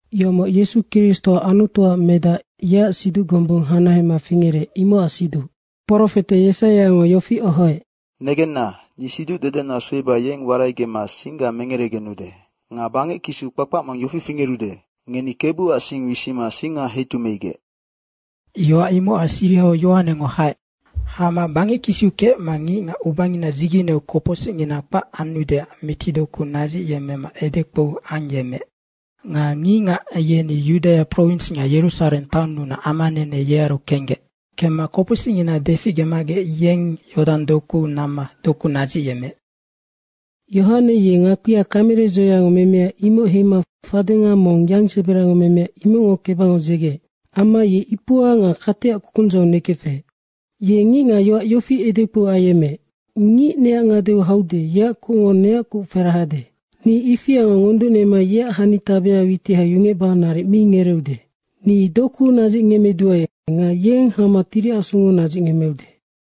Yomoc Yesu Kristo Anutuac Medac, yeac siduc gombung hanahema fingerec, imocac siduc. Profete Yesaiango yofi ohoec, “Negenna, ni siducdedena sueba yeng waraigemma singga mengeregenude. Nga bangec kisiu kpakpac mong yofi fingerude, ‘Ngeni Kebuac sing wisima singa heitumeigec.’” Yoac imocac sirihau Yohanengo haec. Hama bangec kisiu kecma ngicngac ubangina dzigeneu kopocsicngina kpac anudeac mitidoku nadzicgecdeac edekpou ayemmeec. Nga ngicngac yeni Yudaia prowins nga Yerusareng taonnunac amanene yearu kenggec. Kemma kopocsicngina deficgemagec yeng Yodang dokuu namma doku nadzicyemmeec. Yohane ye ngakpia kamere dzoeango memea, imoc heima fadenga mong yangseberango memea, imocngo kebangau dzegeec. Amma ye ipua nga kateac kukundzau nekefec. Ye ngicngac yoac yofi edekpou ayemmeec, “Ngic neac ngadeu haude, yeac kucngo neac kuc ferahade. Ni ifiango ngonducnema yeac hanitabea witiha yungecba naric mi ngereeude. Ni doku nadzicngemmeduae nga yeng hama Tiri Asungo nadzicngemmeude.”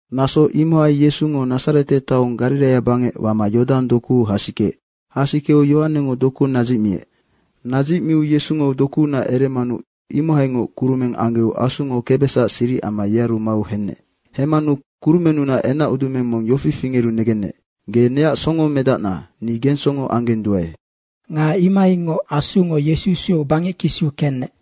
Naso imohai Yesungo Nadzarete taong Gariraia bangec wama Yodang dokuu hasikeec. Hasikeu Yohanengo doku nadzicmiec. Nadzicmiu Yesungo dokuunac eremanu imohaingoc kurumeng anggeu Asungo kebesacac siric amma yearu mau henec. Hemmanu kurumennunac enacudumeng mong yofi fingeru negenec, “Ge neac songomedacna, ni gengsongo anggenduae.” Nga imohaingoc Asungo Yesu sueu bangec kisiu kenec.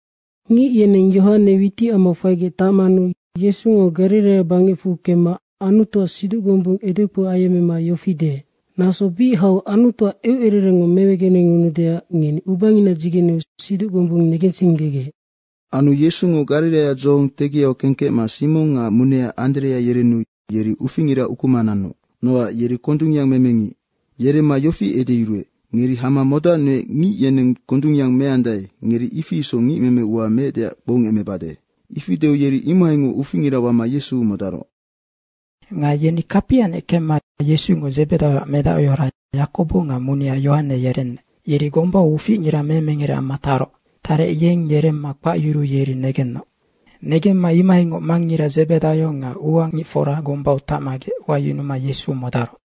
Ngic yeneng Yohane witicamau faigec tacmanu Yesungo Gariraia bangecfu kemma Anutuac siduc gombung edekpou ayemmema yofi deec, “Naso bic hau Anutuac eucererengngo mewegenengunudeac ngeni ubangina dzigeneu siduc gombung negensinggegec.” Anu Yesungo Gariraia dzohong tegiau kengkecma Simong nga munea Anderea yerenu yeri uficngira ukuma nanoc. Nocac yeri kondungyang meme ngic. Yeremma Yesungo yofi edeyuruec, “Ngeri hama modacnuec ngic yeneng kondungyang meandae, ngeri ifi isoc ngicmeme ua meecdeac kpoungemecbade.” Ifi deu yeri imohaingoc uficngira wama Yesu modaroc. Nga yeni kapianec kemma Yesungo Dzebedaioac medahora Yakobo nga munea Yohane yerenec. Yeri gombau uficngira memengere amma taroc. Tarec yeng yeremma kpacyuruu yeri negenoc. Negemma imohaingoc mangngira Dzebedaio nga ua ngicfora gombau tacmagec wayunuma Yesu modaroc.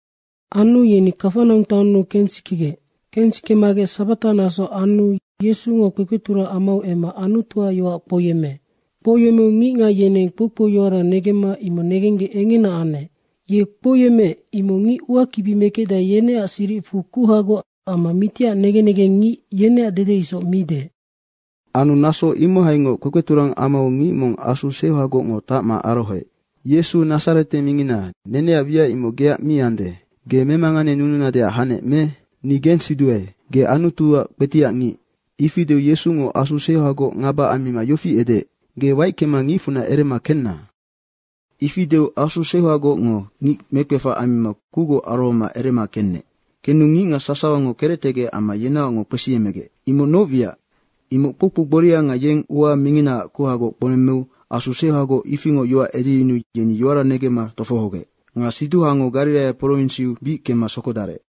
Anu yeni Kafanaung taonnu kensikegec. Kensikemagec sabata naso anu Yesungo kpekpeturang amau emma Anutuac yoac kpouyemmeec. Kpouyemmeu ngicngac yeneng kpoukpouyoara negemma imoc negenggec engena anec. Ye kpouyemmeec, imoc ngic uakibi mekecdae, yeneac siricfu kuhagoc amma mitiac negen negengngic yeneac dede isoc mi deec. Anu naso imohaingoc kpekpeturang amau ngic mong asu seuhagocngo tacma arohoec. “Yesu Nadzarete mingina, neneac wiac imoc geac mi ande. Ge memanganenununadeac hanec me? Ni gensiduaenoc, ge Anutuac kpetiac ngic.” Ifi deu Yesungo asu seuhagoc ngaba ammima yofi edeec, “Ge waickema ngicfunac erema kenna!” Ifi deu asu seuhagocngo ngic mekpefac ammima kucgoc arohoma erema kenec. Kenu ngicngac sasawango kerectegec amma yenaocngoc kpesiemegec, “Imoc noc wiac? Imoc kpoukpou gboria nga yeng ua minginaac kuhagoc kpounemmeu asu seuhagoc ifingoc yoac edeyunuu yeni yoara negemma tofohogec.” Nga siduhango Gariraia prowinsiu bic kemma sokodarec.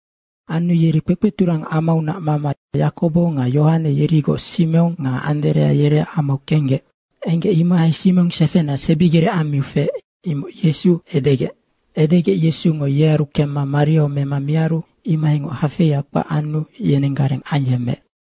Anu yeni kpekpeturang amaunac mama Yakobo nga Yohane yerigoc Simong nga Anderea yereac amau kenggec. Kemma enggec, imohai Simong sefena sebigerec ammiu feec, imoc Yesu edegec. Edegec Yesungo yearu kemma mariau mema miaru imohaingoc hafeia kpac anu yenenggareng ayemmeec.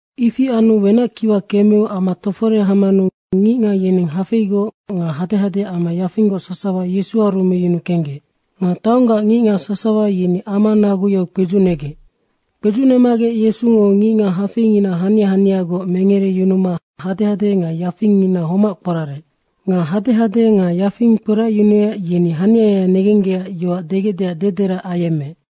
Ifi anu wenac kiwa kemeu ama tofore hamanu ngicngac yeneng hafeigoc nga hadehade amma yafinggoc sasawa Yesuaru meyunu kenggec. Nga taonggac ngicngac sasawa yeni ama naguyau kpedzucnegec. Kpedzucnemagec Yesungo ngicngac hafeingina hania haniagoc mengereyunuma hadehade nga yafingngina homac kporarec. Nga hadehade nga yafing kporacyunuec, yeni haniaya negenggecac yoac degecdeac dederac ayemmeec.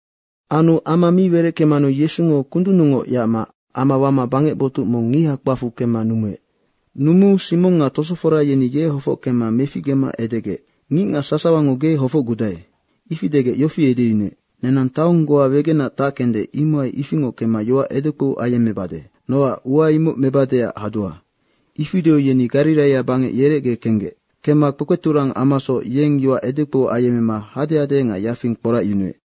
Anu ama mi wereckemmanu Yesungo kundunnungoc yacma ama wama bangec botuc mong ngiha kpacfu kemma numuec. Numuu Simong nga tosofora yeni ye hofockemma meficgema edegec, “Ngicngac sasawango ge hofocgudae.” Ifi degec yofi edeyunuec, “Nenang taong goa wegenac tackende, imohai ifingoc kemma yoac edekpou ayemmebade. Nocac ua imocnoc mebadeac hadua.” Ifi deu yeni Gariraia bangec yerecge kenggec. Kemma kpekpeturang amasoc yeng yoac edekpou ayemmema hadehade nga yafing kporacyunuec.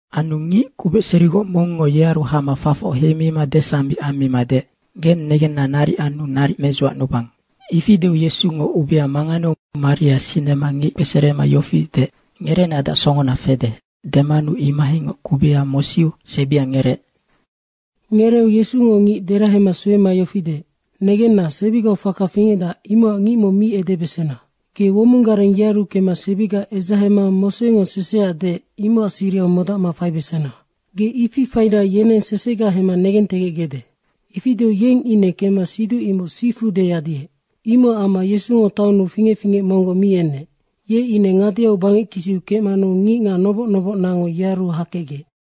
Anu ngic kubecserigoc mongngo yearu hama fafoc heima desambic ammima deec, “Geng negenna naric anu naric medzuacnubang.” Ifi deu Yesungo ubea manganeu maria sinema ngic kpeserema yofi deec, “Ngereenadeac songona fede.” Demanu imohaingoc kubeha mosiu sebia ngereec. Ngereeu Yesungo ngic derahema suema yofi deec, “Negenna, sebigau faka fingecdac, imocac ngic mong mi edebesena. Ge womong gareng yearu kemma sebiga edzahema Mosengo seseac deec, imocac sirihau modacma faibesena! Ge ifi faina yeneng sesega hemma negentegecgecde.” Ifi deu yeng ine kemma siduc imoc sifu deyadiec. Imocac amma Yesungo taonnu fingec fingec monggoc mi enec. Ye ine ngadeau bangec kisiu kecmanu ngicngac noboc nobocnacngo yearu hakecgec.